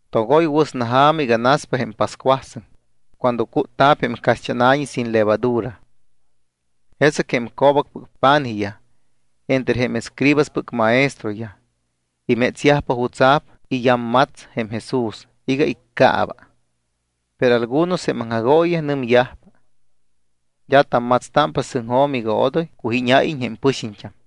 Togoy wɨsna ja̱ma iga naspa jém pascuasɨŋ cuando cútta̱p jém caxt́ána̱ñi sin levadura. Jesɨc jém co̱bacpɨc pa̱nijyaj entre jém escribaspɨc maestroyaj imétsyajpa jutsa̱p iyammats jém Jesús iga iccaaba. Pero algunos jém aŋjagooyiyaj nɨmyajpa: —D́a tammatstámpa sɨŋjo̱m iga odoy cujíñayyajiñ jém pɨxiñt́am.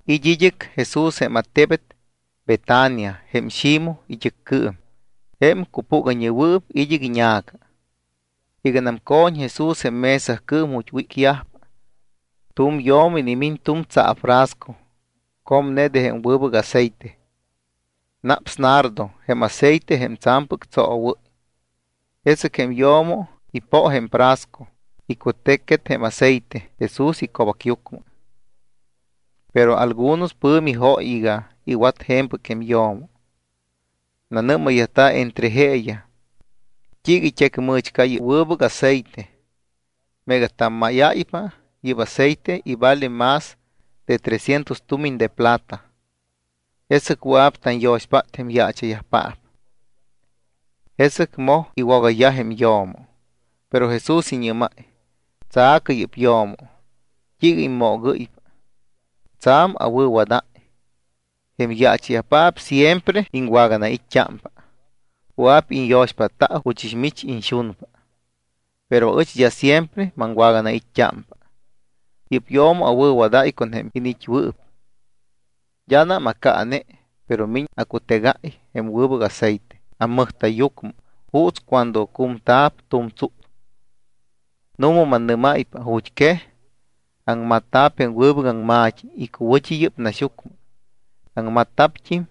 It́ id́ɨc Jesús jém attebet Betania jém Ximoj it́ɨccɨɨm, jém cupúgayñewɨɨp id́ɨc iña̱ca. Iganam co̱ñ Jesús jém mesacɨɨm ju̱t́ wícyajpa, tu̱m yo̱mo inimiñ tu̱m tsaafrasco comne de jém wɨbɨc aceite. Naps nardo jém aceite jém tsa̱mpɨc tsoowɨ́y. Jesɨc jém yo̱mo ipo jém frasco, icutecquet jém aceite Jesús ico̱bacyucmɨ. Pero algunos pɨ̱mi jóy iga iwat je̱mpɨc jém yo̱mo. Nanɨ́mayyajta̱ entre jeeyaj: —¿T́iiga it́ecmɨ̱chca yɨ́p wɨbɨc aceite? Meega tammáypa yɨ́p aceite, ivale más de trescientos tumiñ de plata. Jesɨc wɨa̱p tanyo̱xpát jém yaacha̱yajpaap. Jesɨc moj iwogayyaj jém yo̱mo. Pero Jesús iñɨ́máy: —Tsa̱cɨ yɨ́p yo̱mo. ¿T́iiga immoogɨ́ypa? Tsa̱m awɨ̱wadáy. Jém yaacha̱yajpaap siempre iŋwaganait́t́ámpa. Wɨa̱p iñyo̱xpátta juchɨs mich iñxunpa. Pero aɨch d́a siempre maŋwaganait́t́ámpa. Yɨ́p yo̱mo awɨ̱wadáy con jém iniit́wɨɨp. D́anam acaane, pero miñ acutegáy jém wɨbɨc aceite ammɨjta̱yyucmɨ juuts cuando cumta̱p tu̱m tsúts. Nu̱ma mannɨ́máypa, ju̱t́quej aŋmatta̱p jém wɨbɨc aŋma̱t́i icuwɨ̱t́i yɨ́p naxyucmɨ, aŋmatta̱pt́im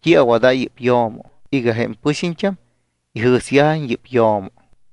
t́i awadáy yɨ́p yo̱mo iga jém pɨxiñt́am ijɨ̱syajiñ yɨ́p yo̱mo.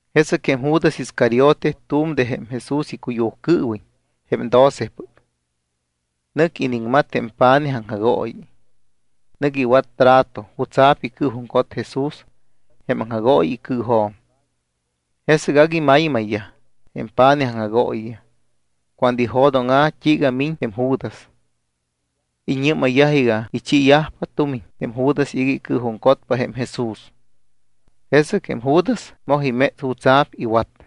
Jesɨc jém Judas Iscariote, tu̱m de jém Jesús icuyujcɨɨwiñ, jém docepɨc, nɨc iniŋmat jém pa̱nij aŋjagooyi. Nɨc iwat trato jutsa̱p icɨɨjuŋcot Jesús jém aŋjagooyi icɨɨjo̱m. Jesɨc agui maymayyaj jém pa̱nij aŋjagooyiyaj cuando ijo̱dóŋa̱ t́iiga miñ jém Judas. Iñɨ́mayyaj iga ichiiyajpa tumiñ jém Judas iga icɨɨjuŋcotpa jém Jesús. Jesɨc jém Judas moj iméts jutsa̱p iwat.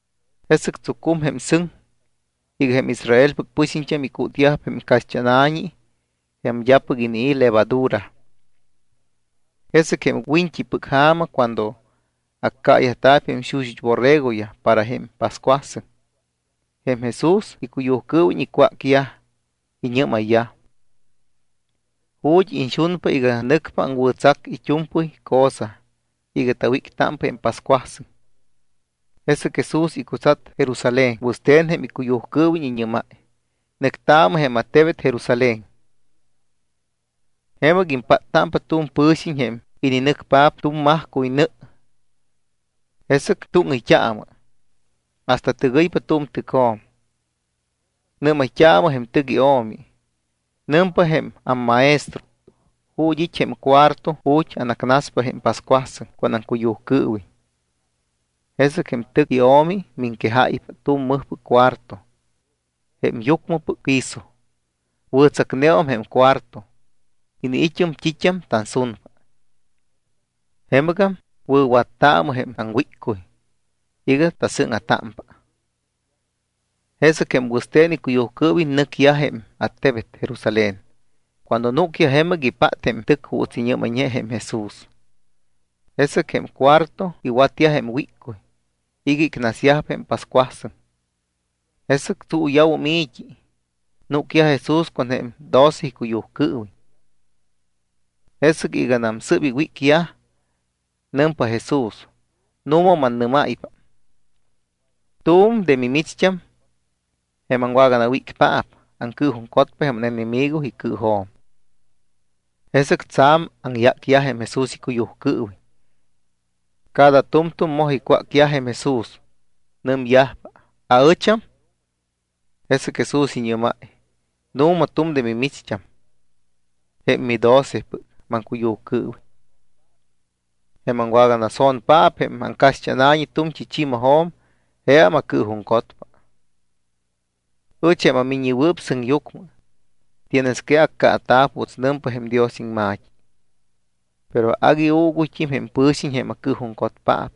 Jesɨc tsucúmum jém sɨŋ iga jém Israelpɨc pɨxiñt́am icútyajpa jém caxt́ána̱ñi jém d́apɨc inii̱ levadura. Jesɨc jém wiñt́ipɨc ja̱ma cuando accaayajta̱p jém xuxut́ borregoyaj para jém pascuasɨŋ, jém Jesús icuyujcɨɨwiñ icwácyaj, iñɨ́mayyaj: —¿Ju̱t́ iñxunpa iga nɨcpa aŋwɨ̱tsacta it́u̱mpɨy cosa iga tawíctámpa jém pascuasɨŋ? Jesɨc Jesús icutsat Jerusalén wɨste̱n jém icuyujcɨɨwiñ. Iñɨ́máy: —Nɨctaamɨ jém attebet Jerusalén. Jemɨc impáttámpa tu̱m pɨ̱xiñ jém ininɨcpaap tu̱m majcuy nɨ. Jesɨc túŋɨyt́aamɨ, hasta tɨgɨypa tu̱m tɨcjo̱m. Nɨ́mayt́aamɨ jém tɨc io̱mi iga: “Nɨmpa jém ammaestro: ¿Ju̱t́ it́ jém cuarto ju̱t́ anacnaspa jém pascuasɨŋ con aŋcuyujcɨɨwiñ?” Jesɨc jém tɨc io̱mi miŋquejáypa tu̱m mɨjpɨc cuarto jém yucmɨpɨc piso. Wɨ̱tsacneum jém cuarto. Iniit́um t́it́am tansunpa. Jemɨgam wɨ̱wattaamɨ jém taŋwíccuy iga tasɨ́ŋa̱támpa. Jesɨc jém wɨste̱n icuyujcɨɨwiñ nɨcyaj jém attebet Jerusalén. Cuando núcyaj jemɨc, ipát jém tɨc juuts iñɨ́mayñe jém Jesús. Jesɨc jém cuarto iwatyaj jém wíccuy iga icnasyajpa jém pascuasɨŋ. Jesɨc tsuuya̱wum i̱t́i, núcyaj Jesús con jém doce icuyujcɨɨwiñ. Jesɨc iganam sɨ́p iwícyaj, nɨmpa jém Jesús: —Nu̱ma mannɨ́máypa, tu̱m de mimicht́am, jém aŋwaganawícpaap, aŋcɨɨjuŋcotpa jém ánenemigo icɨɨjo̱m. Jesɨc tsa̱m aŋyácyaj jém Jesús icuyujcɨɨwiñ. Cada tu̱mtu̱m moj icwácyaj jém Jesús. Nɨmyajpa: —¿Aɨcham? Jesɨc Jesús iñɨ́máy: —Nu̱ma, tu̱m de mimicht́am, jém midocepɨc maŋcuyujcɨɨwiñ, jém aŋwaganaso̱npaap jém caxt́ána̱ñi tu̱mt́i chi̱majo̱m, jeam acɨɨjuŋcotpa. Ɨch jém aMiññewɨɨp Sɨŋyucmɨ, tienes que accaata̱p juuts nɨmpa jém Dios iŋma̱t́i. Pero agui uuguyt́im jém pɨ̱xiñ jém acɨɨjuŋcotpaap.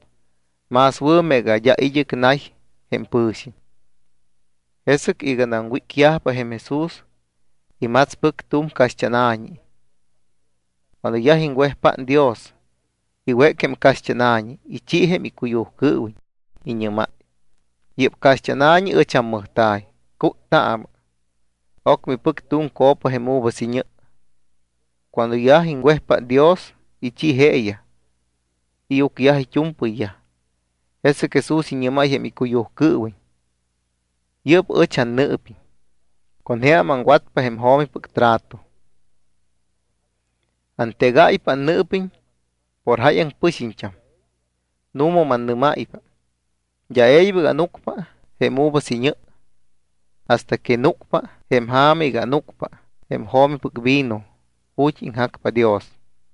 Más wɨ̱ meega d́a id́ɨc nay jém pɨ̱xiñ. Jesɨc iganam wícyajpa, jém Jesús imatspɨc tu̱m caxt́ána̱ñi. Cuando yaj iŋwejpát Dios, iwéc jém caxt́ána̱ñi, ichi jém icuyujcɨɨwiñ, iñɨ́máy: —Yɨ́p caxt́ána̱ñi ɨch ammɨjta̱y. Cúttaamɨ. Ocmɨ ipɨc tu̱m copa jém uvas iñɨ. Cuando yaj iŋwejpát Dios, ichi jeeyaj. Iucyaj it́u̱mpɨyyaj. Jesɨc Jesús iñɨ́máy jém icuyujcɨɨwiñ: —Yɨ́p ɨch annɨɨpiñ, con jeam aŋwatpa jém jo̱mipɨc trato. Antegáypa annɨɨpiñ por jáyaŋ pɨxiñt́am. Nu̱ma mannɨ́máypa, d́a e̱ybɨc ánucpa jém uvas iñɨ hasta que núcpa jém ja̱ma iga ánucpa jém jo̱mipɨc vino ju̱t́ iŋjacpa Dios.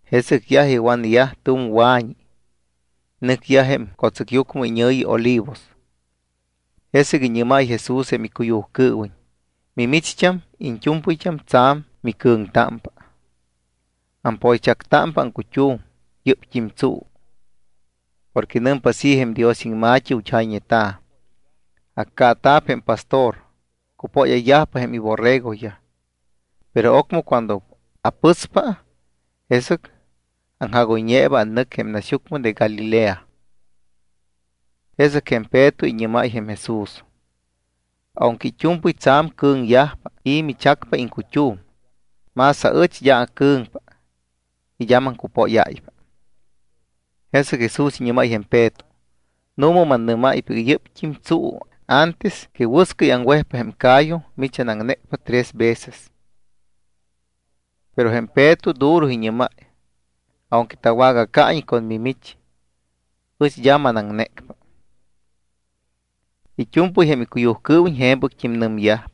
Jesɨc yaj iwanyaj tu̱m wa̱ñi, nɨcyaj jém co̱tsɨcyucmɨ iñɨ̱yi Olivos. Jesɨc iñɨ́máy Jesús jém icuyujcɨɨwiñ: —Mimicht́am iñt́u̱mpɨyt́am tsa̱m micɨ̱ŋtámpa, ampoychactámpa aŋcut́um yɨ́pt́im tsuu. Porque nɨmpa así jém Dios iŋma̱t́i ju̱t́ jayñeta̱: “Accaata̱p jém pastor. Cupóyayyajpa jém iborregoyaj.” Pero ocmɨ cuando apɨspa, jesɨc aŋjagoyñeeba annɨc jém naxyucmɨ de Galilea. Jesɨc jém Peto iñɨ́máy jém Jesús: —Aunque it́u̱mpɨy tsa̱m cɨ̱ŋyajpa y michacpa iŋcut́um, más aɨch d́a acɨ̱ŋpa y d́a maŋcupóyáypa. Jesɨc Jesús iñɨ́máy jém Peto: —Nu̱ma mannɨ́máypa iga yɨ́pt́im tsuu antes que wɨscɨy aŋwejpa jém ca̱yu, mimich anaŋnécpa tres veces. Pero jém Peto duro iñɨ́máy: —Aunque tawagacaiñ con mimich, ɨch d́a manaŋnécpa. It́u̱mpɨy jém icuyujcɨɨwiñ je̱mpɨct́im nɨmyaj.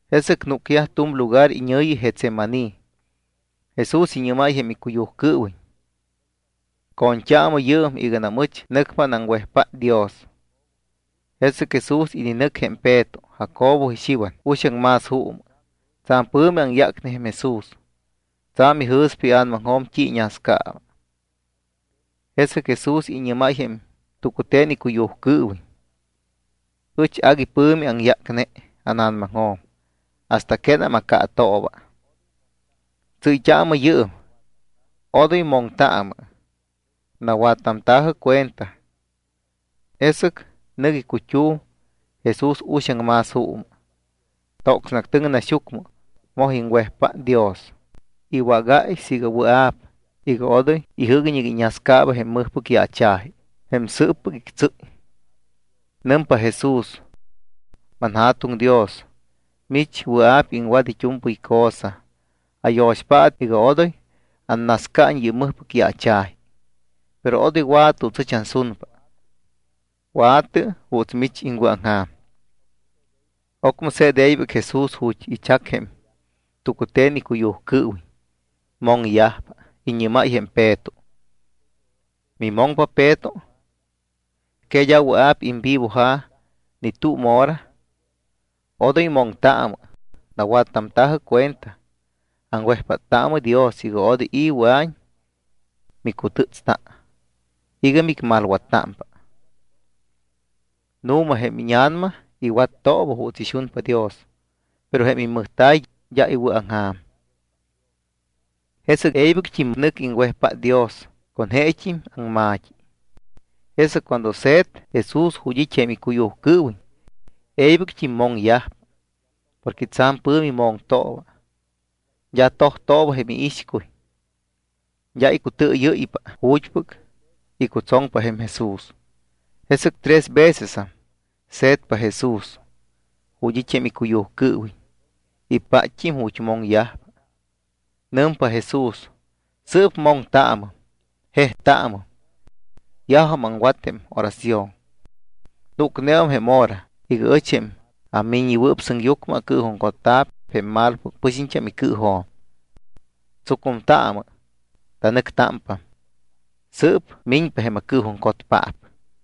Jesɨc núcyaj tu̱m lugar iñɨ̱yi Getsemaní. Jesús iñɨ́máy jém icuyujcɨɨwiñ: —Co̱ñt́aamɨ yɨɨm iganam ɨch nɨcpa anaŋwejpát Dios. Jesɨc Jesús ininɨc jém Peto, Jacobo, y Xiwan uxaŋ más juumɨ. Tsa̱m pɨ̱mi aŋyácne jém Jesús, tsa̱m ijɨ̱spa ia̱namaŋjo̱m t́i iñascaaba. Jesɨc Jesús iñɨ́máy jém tucute̱n icuyujcɨɨwiñ: —Ɨch agui pɨ̱mi aŋyácne ána̱namaŋjo̱m hasta quénam acaatooba. Tsɨ́yt́aamɨ yɨɨm. Odoy moŋtaamɨ. Nawattamta̱jɨ cuenta. Jesɨc nɨc icut́um Jesús uxaŋ más juumɨ. Tocsne actɨŋ naxyucmɨ. Moj iŋwejpát Dios. Iwágáy siiga wɨa̱p, iga odoy ijɨ́guiñ iga iñascaaba jém mɨjpɨc yaacha̱ji, jém sɨɨppɨc ictsɨ́y. Nɨmpa Jesús: —ManJa̱tuŋ Dios, mich wɨa̱p iŋwat it́u̱mpɨy cosa. Ayo̱xpaatɨ iga odoy annascaiñ yɨ́p mɨjpɨc yaacha̱ji. Pero odoy wa̱tɨ juuts ɨch ansunpa. Wa̱tɨ juuts mich iŋwɨ̱aŋja̱m. Ocmɨ se̱t e̱ybɨc Jesús ju̱t́ ichac jém tucute̱n icuyujcɨɨwiñ. Moŋyajpa. Iñɨ́máy jém Peto: —¿Mimoŋpa Peto? ¿Que d́a wɨa̱p imvivoja̱ ni tu̱m hora? Odoy moŋtaamɨ, nawattamta̱jɨ cuenta. Aŋwejpáttaamɨ Dios iga odoy i̱ wɨa̱iñ micutɨ́tsta iga micmalwattámpa. Nu̱ma jém íña̱nama iwattooba juuts ixunpa Dios, pero jém immɨjta̱y d́a iwɨ̱aŋja̱m. Jesɨc e̱ybɨct́im nɨc iŋwejpát Dios con jeet́im aŋma̱t́i. Jesɨc cuando se̱t Jesús ju̱t́ it́ jém icuyujcɨɨwiñ, e̱ybɨct́im moŋyajpa porque tsa̱m pɨ̱mi moŋtooba. D́a tojtooba jém iixcuy. D́a icutɨɨyɨ́ypa ju̱t́pɨc icutsoŋpa jém Jesús. Jesɨc tres vecesam se̱tpa Jesús ju̱t́ it́ jém icuyujcɨɨwiñ. Ipátt́im ju̱t́ moŋyajpa. Nɨmpa Jesús: —Sɨɨp moŋtaamɨm, jejtaamɨm. Yajum aŋwat jém oración. Núcneum jém hora iga ɨch, jém aMiññewɨɨp Sɨŋyucmɨ, acɨɨjuŋcotta̱p jém malopɨc pɨxiñt́am icɨɨjo̱m. Tsucumtaamɨ, tanɨctámpam. Sɨɨp miñpa jém acɨɨjuŋcotpaap.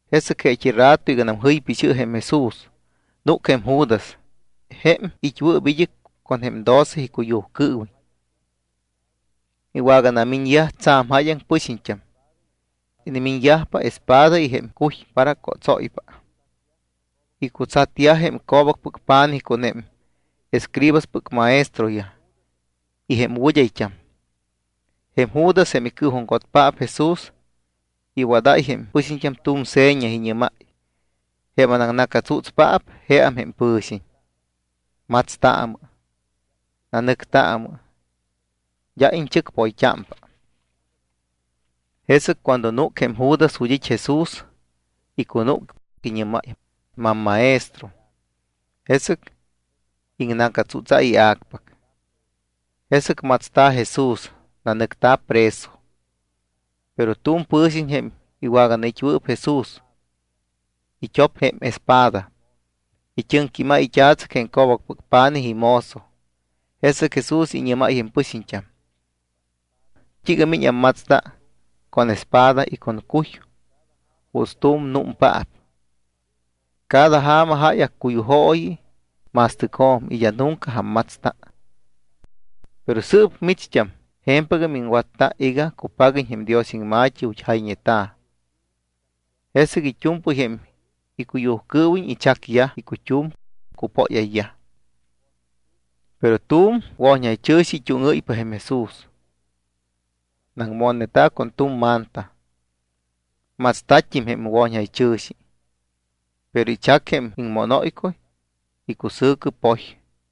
Jesɨc jeet́i rato iganam jɨypa ixɨ jém Jesús, núc jém Judas jém it́wɨɨp id́ɨc con jém doce icuyujcɨɨwiñ. Iwaganamiñyajpa tsa̱m jáyaŋ pɨxiñt́am. Inimiñyajpa espada y jém cuy para cótsóypa. Icutsatyaj jém co̱bacpɨc pa̱nijyaj con jém escribaspɨc maestroyaj y jém wɨd́ayt́am. Jém Judas, jém icɨɨjuŋcotpaap Jesús, iwadáy jém pɨxiñt́am tu̱m seña. Iñɨ́máy: —Jém anaŋna̱catsútspaap jeam jém pɨ̱xiñ. Matstaamɨ, nanɨctaamɨ, d́a iñchɨcpoyt́ámpa. Jesɨc cuando núc jém Judas ju̱t́ it́ Jesús, icunúc, iñɨ́máy: —MamMaestro. Jesɨc iŋna̱catsútsáy ia̱cpac. Jesɨc matsta̱ Jesús, nanɨcta̱ preso. Pero tu̱m pɨ̱xiñ, jém iwaganait́wɨɨp Jesús, it́op jém espada, it́ɨŋquímáy it́a̱tsɨc jém co̱bacpɨc pa̱nij imozo. Jesɨc Jesús iñɨ́máy jém pɨxiñt́am: —¿T́iiga miñ ammatsta con espada y con cuy juuts tu̱m anúmpaap? Cada ja̱ma jáy accuyujooyi ma̱stɨcjo̱m y d́a nunca ammatsta. Pero sɨɨp micht́am je̱mpɨgam iŋwatta iga cupaguiñ jém Dios iŋma̱t́i ju̱t́ jayñeta̱. Jesɨc it́u̱mpɨy jém icuyujcɨɨwiñ ichacyaj icut́um, cupóyayyaj. Pero tu̱m wo̱ñjaychɨ̱xi it́úŋɨ́ypa jém Jesús. Naŋmonneta̱ con tu̱m manta. Matsta̱t́im jém wo̱ñjaychɨ̱xi. Pero ichac jém iŋmónóycuy, icusɨ̱cɨ poy.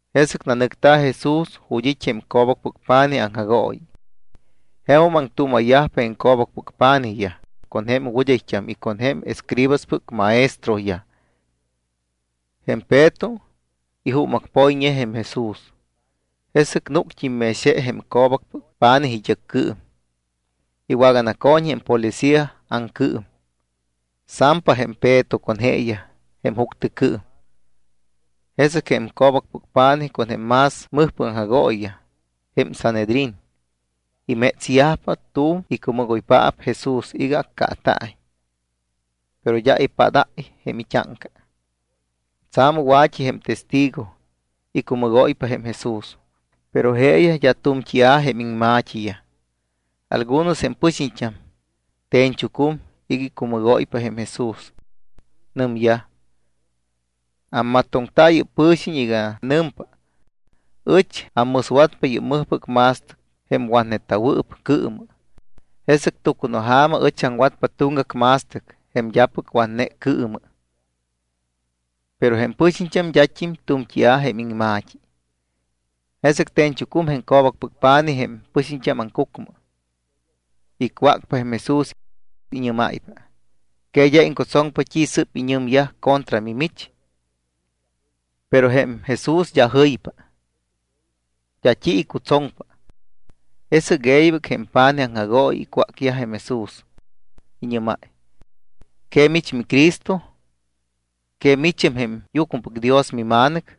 Jesɨc nanɨcta̱ Jesús ju̱t́ it́ jém co̱bacpɨc pa̱nij aŋjagooyi. Jemum aŋtuuma̱yaj jém co̱bacpɨc pa̱nijyaj, con jém wɨd́ayt́am y con jém escribaspɨc maestroyaj. Jém Peto ijuumacpoyñe jém Jesús. Jesɨc núct́im mex je jém co̱bacpɨc pa̱nij it́ɨccɨɨm. Iwaganaco̱ñ jém policía aŋcɨɨm. Sampa jém Peto con jeeyaj jém juctɨcɨɨm. Jesɨc jém co̱bacpɨc pa̱nijyaj con jém más mɨjpɨc aŋjagooyiyaj, jém Sanhedrín, imétsyajpa tu̱m icumɨgoypaap Jesús iga accaata̱iñ. Pero d́a ipádáy jém it́áŋca. Tsa̱m wa̱t́i jém testigo icumɨgóypa jém Jesús, pero jeeyaj d́a tu̱mt́ia̱ jém iŋma̱t́iyaj. Algunos jém pɨxiñt́am te̱ñchucum iga icumɨgóypa jém Jesús. Nɨmyaj: —Ammatoŋta yɨ́p pɨ̱xiñ iga nɨmpa: “Ɨch ammɨswatpa yɨ́p mɨjpɨc ma̱stɨc jém watneta̱wɨɨp cɨɨmɨ, jesɨc tucunaja̱ma ɨch aŋwatpa tuŋgac ma̱stɨc jém d́apɨc watne cɨɨmɨ.” Pero jém pɨxiñt́am d́at́im tu̱mt́ia̱ jém iŋma̱t́i. Jesɨc te̱ñchucum jém co̱bacpɨc pa̱nij jém pɨxiñt́am aŋcucmɨ. Icwácpa jém Jesús. Iñɨ́máypa: —¿Que d́a iŋcutsoŋpa t́i sɨ́p iñɨmyaj contra mimich? Pero jém Jesús d́a jɨypa. D́a t́i icutsoŋpa. Jesɨc e̱ybɨc jém pa̱nij aŋjagooyi icwác jém Jesús. Iñɨ́máy: —¿Que mich miCristo? ¿Que micham jém Yucmɨpɨc Dios miMa̱nɨc?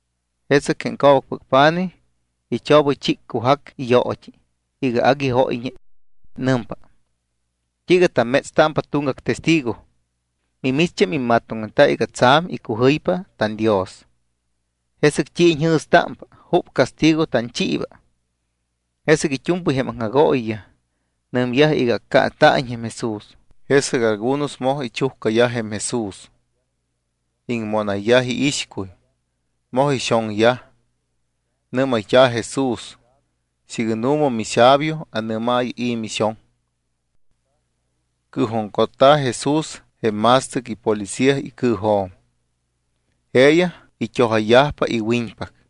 Jesɨc jém co̱bacpɨc pa̱nij ichobɨychíccujac iyoot́i iga agui jóyñe. Nɨmpa: —¿T́iiga tammétspa tuŋgac testigo? Mimicht́am immatoŋneta iga tsa̱m icujɨypa tanDios. ¿Jesɨc t́i iñjɨ̱stámpa? ¿Jup castigo tanchiiba? Jesɨc it́u̱mpɨy jém aŋjagooyiyaj nɨmyaj iga accaata̱iñ jém Jesús. Jesɨc algunos moj ichujcayaj jém Jesús. Iŋmónayyaj iixcuy. Moj ixoŋyaj. Nɨ́mayt́a̱ Jesús: —Siiga nu̱ma mixabio, anɨ́maayɨ i̱ mixoŋ. Cɨɨjuŋcotta̱ Jesús jém ma̱stɨc ipolicía icɨɨjo̱m. Jeeyaj it́ojayyajpa iwiñpac.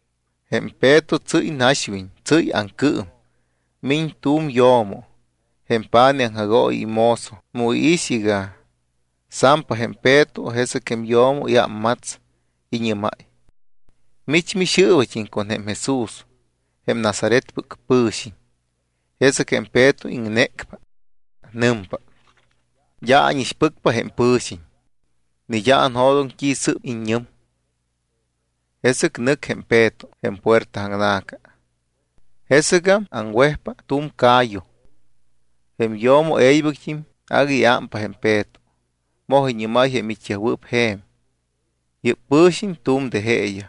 Jém Peto tsɨ́y naxwiñ, tsɨ́y aŋcɨɨm. Miñ tu̱m yo̱mo, jém pa̱nij aŋjagooyi imozo. Mu iix iga sampa jém Peto, jesɨc jém yo̱mo iámmats, iñɨ́máy: —Mich mixɨɨbat́im con jém Jesús jém Nazaretpɨc pɨ̱xiñ. Jesɨc jém Peto iŋnécpa. Nɨmpa: —D́a ánixpɨcpa jém pɨ̱xiñ. Ni d́a anjo̱doŋ t́i sɨ́p iññɨm. Jesɨc nɨc jém Peto jém puerta aŋna̱ca. Jesɨgam aŋwejpa tu̱m ca̱yu. Jém yo̱mo e̱ybɨct́im agui iámpa jém Peto, moj iñɨ́máy jém it́yajwɨɨp je̱m: —Yɨ́p pɨ̱xiñ tu̱m de jeeyaj.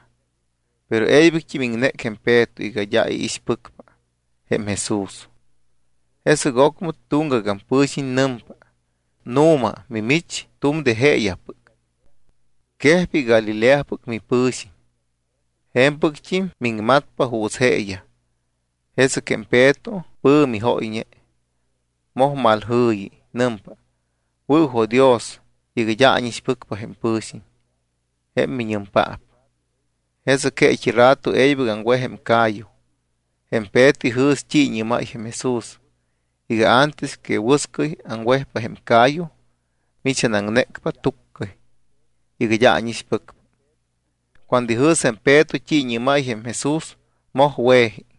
Pero e̱ybɨct́im iŋnéc jém Peto iga d́a iixpɨcpa jém Jesús. Jesɨc ocmɨ tuŋgagam pɨ̱xiñ nɨmpa: —Nu̱ma mimich tu̱m de jeeyajpɨc. Quejpa iga Galileapɨc mipɨ̱xiñ. Je̱mpɨct́im miŋmatpa juuts jeeyaj. Jesɨc jém Peto pɨ̱mi jóyñe. Moj malmaljɨ̱yi. Nɨmpa: —Wɨ̱jo̱dios iga d́a ánixpɨcpa jém pɨ̱xiñ, jém miñɨmpaap. Jesɨc jeet́i rato e̱ybɨc aŋwej jém ca̱yu. Jém Peto ijɨ̱s t́i iñɨ́máy jém Jesús iga: “Antes que wɨscɨy aŋwejpa jém ca̱yu, mimich anaŋnécpa túccɨy iga d́a ánixpɨcpa.” Cuando ijɨ̱s jém Peto t́i iñɨ́máy jém Jesús, moj we̱ji.